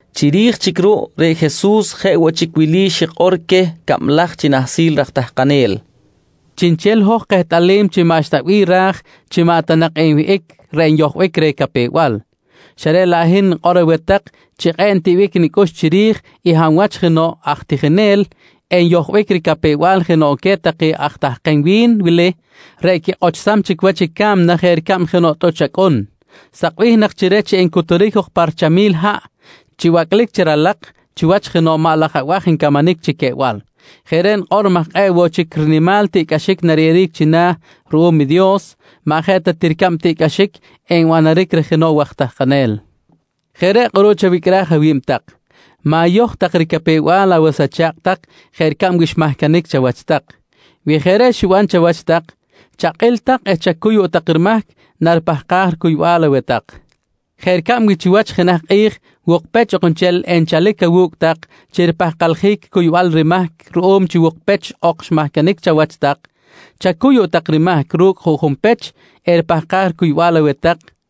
Chiri̱j chic ruꞌ, reꞌ Jesus jeꞌ woꞌ chic wili xikꞌor queh cablaj chi nahsil raj tahkanel: «Chiꞌnchel i hoj kehtꞌalim chi maꞌxta bih ra̱j chi maꞌ ta nak enwihꞌic reꞌ nyojbic reh capew-bal, xa reꞌ laꞌ hin nikꞌor aweh tak chi kꞌe̱ꞌ ntiꞌbic nicꞌux chiri̱j i hab wach jenoꞌ aj tijinel enyojbic ricapew-bal jenoꞌ queh take aj tahkem wi̱n wili reꞌ quikꞌochsam chic wach i ca̱mna jeꞌ ricab i jenoꞌ tꞌuch acꞌun, sakbih nak chi reh chi encuturic jok pa richamil haꞌ chi bacꞌlic chi ralak chiwach jenoꞌ maꞌ laj abaj ncamanic chi queꞌbal. Jeꞌ reꞌ nikꞌor maj kꞌe̱ꞌ woꞌ chic rinimal tiꞌcꞌaxic nariyeꞌeric china̱ ruꞌum i Dios maꞌ jeꞌ ta ti ricab i tiꞌcꞌaxic enbanaric reh jenoꞌ waj tahkanel. Jeꞌ reꞌ kꞌuruꞌ chawicꞌraj awi̱b tak. Ma̱yoj tak ricapew-bal awas acha̱kꞌ tak jeꞌ ricab wi xmahcanic chawach tak. Wi jeꞌ reꞌ xiban chawach tak, chakꞌil tak eh chacuy woꞌ tak rimahc naripahkaj ricuybal aweh tak. Jeꞌ ricab wi chiwach jenaj kꞌi̱j, wukpech ok nchel enchalic awu̱cꞌ tak chi ripahkaljic cuybal rimahc ruꞌum chi wukpech ok xmahcanic chawach tak, chacuy woꞌ tak rimahc ru̱cꞌ i juꞌjun pech eripahkaj ricuybal aweh tak, nqui Jesus queh.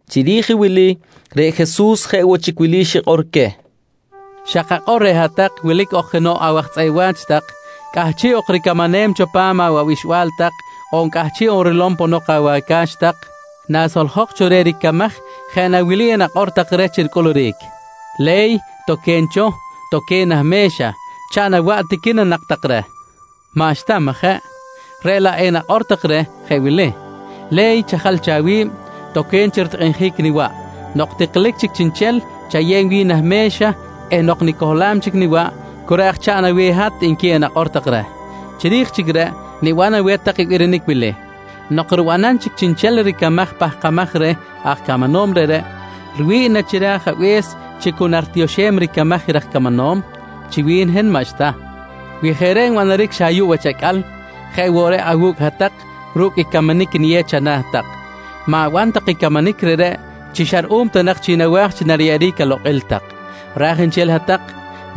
Chiri̱j i wili reꞌ Jesus jeꞌ woꞌ chic wili xikꞌor queh: «Xa kakꞌor reꞌ hat-tak wilic ok jenoꞌ awaj tzꞌeꞌ wa̱ch tak cꞌahchiꞌ ok ricamanem cho pa̱m awabixba̱l tak on cꞌahchiꞌ ok rilom ponok awaca̱x tak. Nasoljok cho reh ricamaj jeꞌ na nak wili enakꞌor tak reh chi ricꞌuluric?: ‹Le̱y, toque̱n cho. Toque̱n nah me̱xa, chaꞌn awaꞌ, tiqui na nak tak reh? «Maꞌxta, majeꞌ? Reꞌ laꞌ nak enakꞌor tak reh jeꞌ wili: ‹Le̱y, chajal cho awi̱b. Toque̱n chi ritikꞌinjic niwaꞌ. Nok tiklic chic chiꞌnchel, chayew wi̱n nah me̱xa eh nok nicohlam chic niwaꞌ, cu reꞌ aj chaꞌn aweh i hat, nqui nak enakꞌor tak reh. «Chiri̱j chic reꞌ, niban aweh tak i birinic wili: Nok ribanam chic chiꞌnchel ricamaj pahkamaj reh aj camanom reꞌreꞌ, riwi̱ꞌ na chi reh ajabe̱s chi cu naritioxem ricamaj i raj camanom? Chi wi̱n hin maꞌxta. Wi jeꞌ reꞌ nbanaric xa ayuꞌ wach acꞌal, jeꞌ woꞌ reꞌ awu̱cꞌ hat-tak ru̱cꞌ i camanic niyew chana̱ tak, ma̱ban tak i camanic reꞌreꞌ chi xa ruꞌum ta nak chi nawa̱j chi enyeꞌeric alokꞌil tak. Raj nchel hat-tak,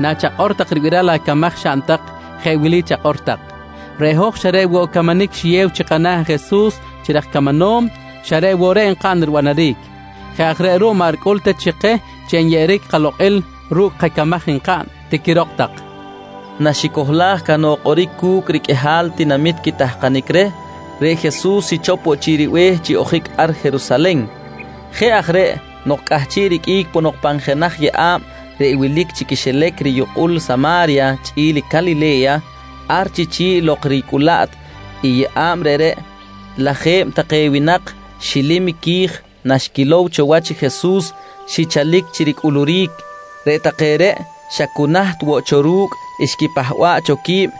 nachakꞌor tak ribiral acamaj xaꞌn tak jeꞌ wili chakꞌor tak: ‹Reꞌ hoj xa reꞌ woꞌ camanic riyeb chi kana̱ i Jesus chi raj camanom, xa reꞌ woꞌ reꞌ nkaꞌn ribanaric. Jeꞌ aj reꞌ ruꞌ maꞌ ricꞌul ta chi keh chi nariyeꞌeric kalokꞌil ru̱cꞌ kacamaj nkaꞌn, tiquirok tak, nqui Jesus queh. Naxicohlaj cahnok kꞌoric cu̱cꞌ riqꞌuihal tinamit quitahkanic reh, reꞌ Jesus xichop woꞌ chic ribe̱h chi ojic ar Jerusalen. Jeꞌ aj reꞌ nok cꞌahchiꞌ riqꞌuic ponok pan jenaj yeꞌa̱b reꞌ wilic chi quixilac riyukꞌul Sama̱rya chꞌi̱l Calile̱ya ar chi chi̱ꞌ lok ricꞌulaꞌt i yeꞌa̱b reꞌreꞌ, lajeb take winak xilim qui̱j naxquilow cho wach i Jesus, xichalic chi ricꞌuluric. Reꞌ take reꞌ xa cu naht cho ru̱cꞌ, xquipahba̱ꞌ cho qui̱b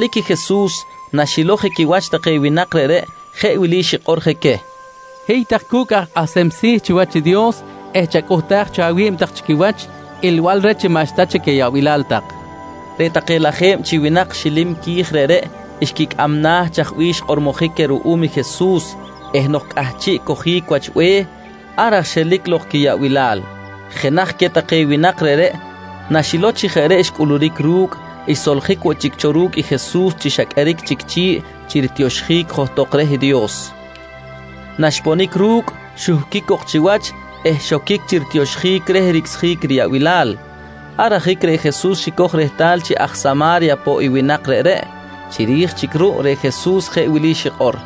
Chalic i Jesus naxilow je quiwach take winak reꞌreꞌ jeꞌ wili xikꞌor je queh: «Hiy tak cu̱cꞌ aj kꞌahsem si̱ chiwach i Dios eh chacꞌuhtaj cho awi̱b tak chi quiwach ilbal reh chi maꞌxta chic ayaꞌbilal tak, nqui je queh. Reꞌ take lajeb chi winak xilim qui̱j reꞌreꞌ xquicꞌam na̱ chaj bih xkꞌormojic queh ruꞌum Jesus eh nok cꞌahchiꞌ cojic wach be̱h, ar aj xelic lok quiyaꞌbilal. Jenaj queh take winak reꞌreꞌ naxilow chi jeꞌ reꞌ xcꞌuluric ru̱cꞌ xsoljic woꞌ chic cho ru̱cꞌ i Jesus chi xa qꞌueric chic chi̱ꞌ chi ritioxjic johtok reh Dios. Naxponic ru̱cꞌ xuhquic cok chiwach eh xoquic chi ritioxjic reh ricꞌsjic reh riyaꞌbilal. Ar ajic reꞌ Jesus xicoj rehtal chi aj Sama̱rya poꞌ i winak reꞌreꞌ. Chiri̱j chic ruꞌ reꞌ Jesus jeꞌ wili xikꞌor: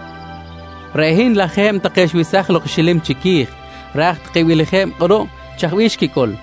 «Reꞌ hin lajeb take xwesaj lok i xilim chiqui̱j, raj take beleje̱b kꞌuruꞌ chaj bih xquicꞌul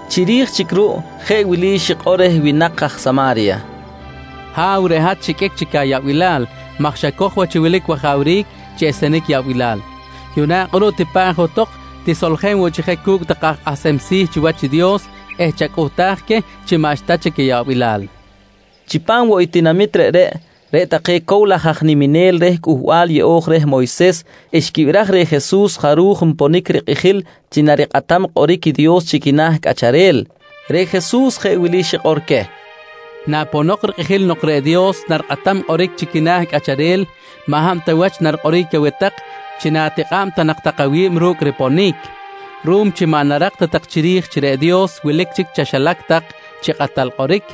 Chiri̱j chic ruꞌ jeꞌ wili xikꞌor reh winak aj Sama̱rya: «Ha̱w, reꞌ hat xiqꞌuic ayaꞌbilal maj xacoj wach chi wilic wajawric chi esenic yaꞌbilal. Yuꞌna kꞌuruꞌ tipa̱ꞌ johtok, tisoljen woꞌ chic je cu̱cꞌ take aj kꞌahsem si̱ chiwach i Dios eh chacꞌuhtaj queh chi maꞌxta chic ayaꞌbilal, nqui reh. Chipam woꞌ i tinamit reꞌreꞌ, reꞌ take cow laj aj niminel reh Cꞌuhbal Yeꞌo̱j reh Moyses xquibiraj reh Jesus jaruj nponic rikꞌijil chi narikꞌatam kꞌoric i Dios chi quina̱ cꞌacharel. Reꞌ Jesus jeꞌ wili xikꞌor queh: «Naponok rikꞌijil nok reꞌ Dios narikꞌatam kꞌoric chi quina̱ cꞌacharel maꞌ hab ta wach narikꞌoric aweh tak chi na̱tikꞌa̱b ta nak tak awi̱b ru̱cꞌ riponic. Ruꞌum chi maꞌ narak ta tak chiri̱j chi reꞌ Dios wilic chic chaxilac tak chi kꞌatal kꞌoric,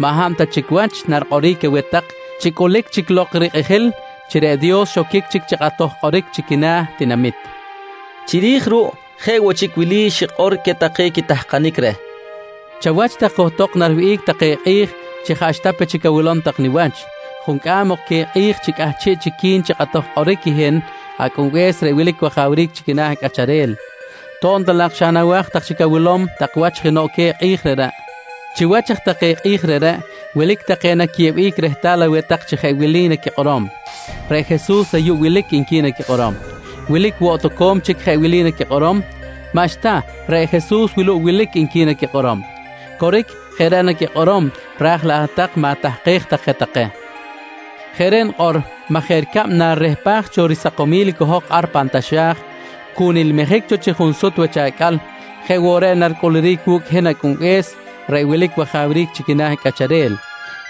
maꞌ hab ta chic wach narikꞌoric aweh tak chi cꞌulic chic lok rikꞌijil chi reꞌ Dios xoquic chic chi kꞌatoj kꞌoric chi quina̱ tinamit, nqui queh. Chiri̱j ruꞌ jeꞌ woꞌ chic wili xikꞌor queh take quitahkanic reh: «Chawach tak johtok nariwihꞌic take kꞌi̱j chi jaꞌxta pe chic awilom tak wach juncꞌam ok queh kꞌi̱j chi cꞌahchiꞌ chic qui̱n chi kꞌatoj kꞌoric i hin Acꞌunbe̱s reꞌ wilic wajawric chi quina̱ cꞌacharel, to̱b ta laꞌ xa nawa̱j nak tak chic chi na̱wilom tak wach jenoꞌ queh kꞌi̱j reꞌreꞌ. Chiwach aj take kꞌi̱j reꞌreꞌ, wilic take naquiyeꞌbic rehtal aweh tak chi jeꞌ wili naquikꞌorom: ‹Reꞌ Jesus ayuꞌ wilic, nqui naquikꞌorom. «Wilic woꞌ toco̱m chic jeꞌ wili naquikꞌorom: ‹Maꞌxta, reꞌ Jesus wuluꞌ wilic, nqui naquikꞌorom. «Coric, jeꞌ reꞌ naquikꞌorom ra̱j laꞌ hat-tak ma̱tahkej tak je take. Jeꞌ reꞌ nikꞌor maj jeꞌ ricab chi narirehpaj cho risakomil i cohok ar pan taxa̱j, cu nilmijic cho chi junsut wach acꞌal, jeꞌ woꞌ reꞌ naricꞌuluric wu̱cꞌ i hin Acꞌunbe̱s reꞌ wilic wajawric chi quina̱ cꞌacharel,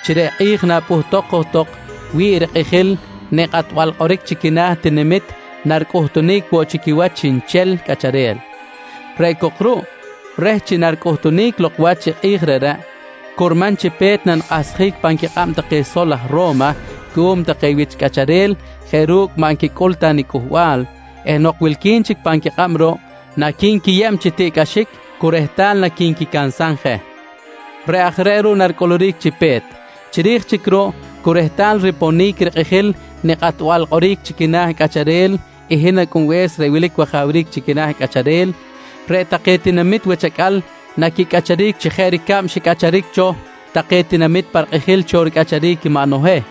chi reꞌ kꞌi̱j napꞌuhtok johtok wi̱ꞌ rikꞌijil nikꞌatbal kꞌoric chi quina̱ tinamit naricꞌuhtunic woꞌ chi quiwach chiꞌnchel cꞌacharel. Reꞌ cok ruꞌ reh chi naricꞌuhtunic lok wach i kꞌi̱j reꞌreꞌ, curman chi pe̱t nanikꞌahsjic pan quikꞌab take sol aj Ro̱ma cuꞌum take wich cꞌacharel jeꞌ ru̱cꞌ maꞌ xquicꞌul ta nicꞌuhbal eh nok wilqui̱n chic pan quikꞌab ruꞌ, naqui̱nquiyeb chi tiꞌcꞌaxic cu rehtal naqui̱nquicansam je. «Reꞌ aj reꞌ ruꞌ naricꞌuluric chi pe̱t. Chiri̱j chic ruꞌ cu rehtal riponic rikꞌijil nikꞌatbal kꞌoric chi quina̱ cꞌacharel i hin Acꞌunbe̱s reꞌ wilic wajawric chi quina̱ cꞌacharel, reꞌ take tinamit wach acꞌal naquicꞌacharic chi jeꞌ ricab xicꞌacharic cho take tinamit pa rikꞌijil cho ricꞌacharic i maꞌ Noheh.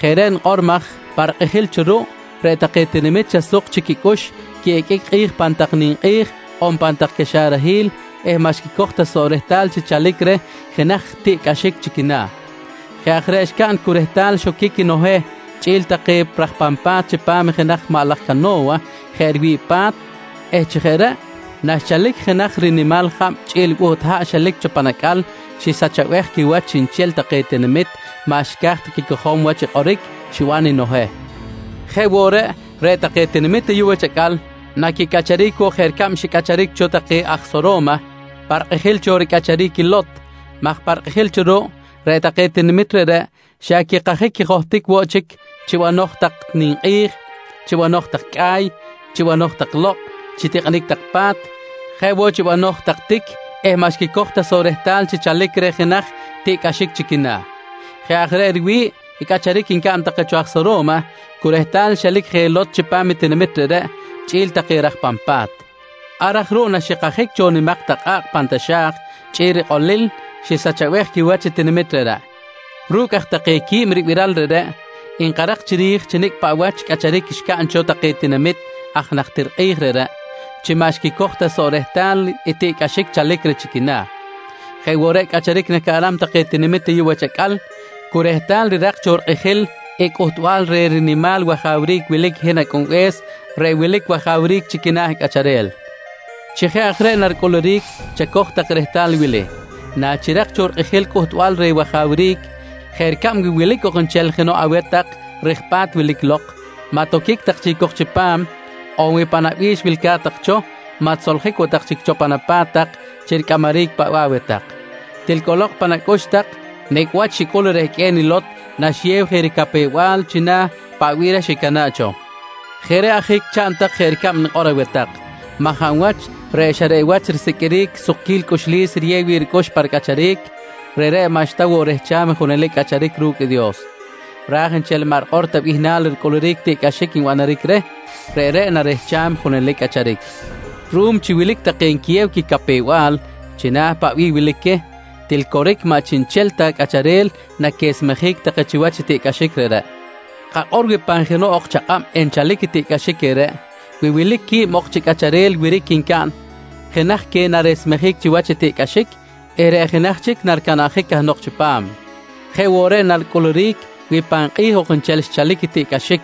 Jeꞌ reꞌ nikꞌor maj pa rikꞌijil cho ruꞌ, reꞌ take tinamit xa suk chic quicꞌux quiꞌiqꞌuic kꞌi̱j pan tak ninkꞌi̱j on pan tak caxarahil eh maꞌ xquicoj ta soꞌ rehtal chi chalic reh jenaj tiꞌcꞌaxic chi quina̱. Jeꞌ aj reꞌ xcaꞌn cu rehtal xoquic i Noheh chꞌi̱l take raj pan pa̱t chipam i jenaj maꞌ laj cano̱wa jeꞌ riwi̱ꞌ pa̱t eh chi jeꞌ reꞌ, naxchalic i jenaj rinimal jab chꞌi̱l buht haꞌ xelic cho pan acꞌal xisachabej quiwach chiꞌnchel take tinamit maꞌ xca̱j ta quicojom wach i kꞌoric xiban i Noheh. «Jeꞌ woꞌ reꞌ, reꞌ take tinamit ayuꞌ wach acꞌal naquicꞌacharic woꞌ jeꞌ ricab xicꞌacharic cho take aj Soro̱ma pa rikꞌijil cho ricꞌacharic i Lot maj pa rikꞌijil cho ruꞌ, reꞌ take tinamit reꞌreꞌ xa quikajic quijohtic woꞌ chic chi banoj tak ninkꞌi̱j, chi banoj tak cꞌa̱y, chi banoj tak lokꞌ, chi tikꞌinic tak pa̱t, jeꞌ woꞌ chi banoj tak tic eh maꞌ xquicoj ta soꞌ rehtal chi chalic reh jenaj tiꞌcꞌaxic chi quina̱. Jeꞌ aj reꞌ riwi̱ꞌ cꞌacharic ncaꞌn take aj Soro̱ma cu rehtal xelic je i Lot chipam i tinamit reꞌreꞌ chꞌi̱l take raj pan pa̱t. Ar aj ruꞌ naxikajic cho nimak tak kꞌa̱kꞌ pan taxa̱j chꞌi̱l rikꞌolil, xisachabej quiwach i tinamit reꞌreꞌ. «Ru̱cꞌ aj take qui̱b ribiral reꞌreꞌ, nkarak chiri̱j chi nicꞌ paꞌ wach cꞌacharic xcaꞌn cho take tinamit aj najtir kꞌi̱j reꞌreꞌ chi maꞌ xquicoj ta soꞌ rehtal i tiꞌcꞌaxic xchalic chi quina̱, jeꞌ woꞌ reꞌ cꞌacharic nacaꞌnam take tinamit ayuꞌ wach acꞌal cu rehtal rirak cho rikꞌijil i cꞌuhtbal reh rinimal wajawric wilic i hin Acꞌunbe̱s reꞌ wilic wajawric chi quina̱ cꞌacharel. Chi jeꞌ aj reꞌ naricꞌuluric chacoj tak rehtal i wili: Nachirak cho rikꞌijil i cꞌuhtbal reh wajawric, jeꞌ ricab wi wilic ok nchel jenoꞌ aweh tak rij ripa̱t wilic lok, maꞌ toquic tak chic cok chipam, on wi pan awabi̱x wilca̱t tak cho, maꞌ tisoljic woꞌ tak chic cho pan apa̱t tak chi ricꞌamaric paꞌ bih aweh tak. Til cꞌolok pan acꞌux tak nicꞌ wach xicꞌul rehqꞌue̱n i Lot naxiyew je ricapew-bal china̱ i paꞌ bih reh xicana̱ꞌ cho! Jeꞌ reꞌ ajic, chaꞌn tak jeꞌ ricab nikꞌor aweh tak maj hab wach reꞌ xa reꞌ wach i risiqꞌuiric i sukquil cꞌuxlis riyew wi̱ꞌ ricꞌux pa ricꞌacharic, reꞌreꞌ maꞌxta woꞌ rehcham i junelic cꞌacharic ru̱cꞌ i Dios, ra̱j nchel i maꞌ rikꞌor ta bihnal ricꞌuluric i tiꞌcꞌaxic nbanaric reh, reꞌreꞌ narehcham i junelic cꞌacharic. «Ruꞌum chi wilic take nquiyew quicapew-bal china̱ i paꞌ bih wilic queh, til coric maꞌ chiꞌnchel ta cꞌacharel naquesmejic take chiwach i tiꞌcꞌaxic reꞌreꞌ. Kakꞌor wi pan jenoꞌ ok chakꞌab enchalic i tiꞌcꞌaxic reꞌreꞌ, wi wilic quib ok chi cꞌacharel wiric ncaꞌn jenaj queh naresmejic chiwach i tiꞌcꞌaxic eh reꞌ jenaj chic naricanabjic cahnok chipam. Jeꞌ woꞌ reꞌ naricꞌuluric wi pan kꞌi̱j ok nchel enchalic i tiꞌcꞌaxic.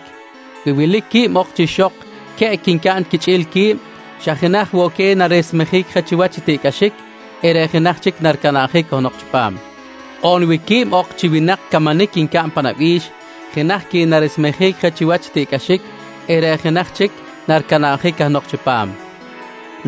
Wi wilic quib ok chi ixok queꞌc ncaꞌn chi quichꞌi̱l qui̱b, xa jenaj woꞌ queh naresmejic je chiwach i tiꞌcꞌaxic eh reꞌ jenaj chic naricanabjic cahnok chipam. On wi quib ok chi winak camanic ncaꞌn pan abi̱x, jenaj queh naresmejic je chiwach i tiꞌcꞌaxic eh reꞌ jenaj chic naricanabjic cahnok chipam, nqui Jesus queh.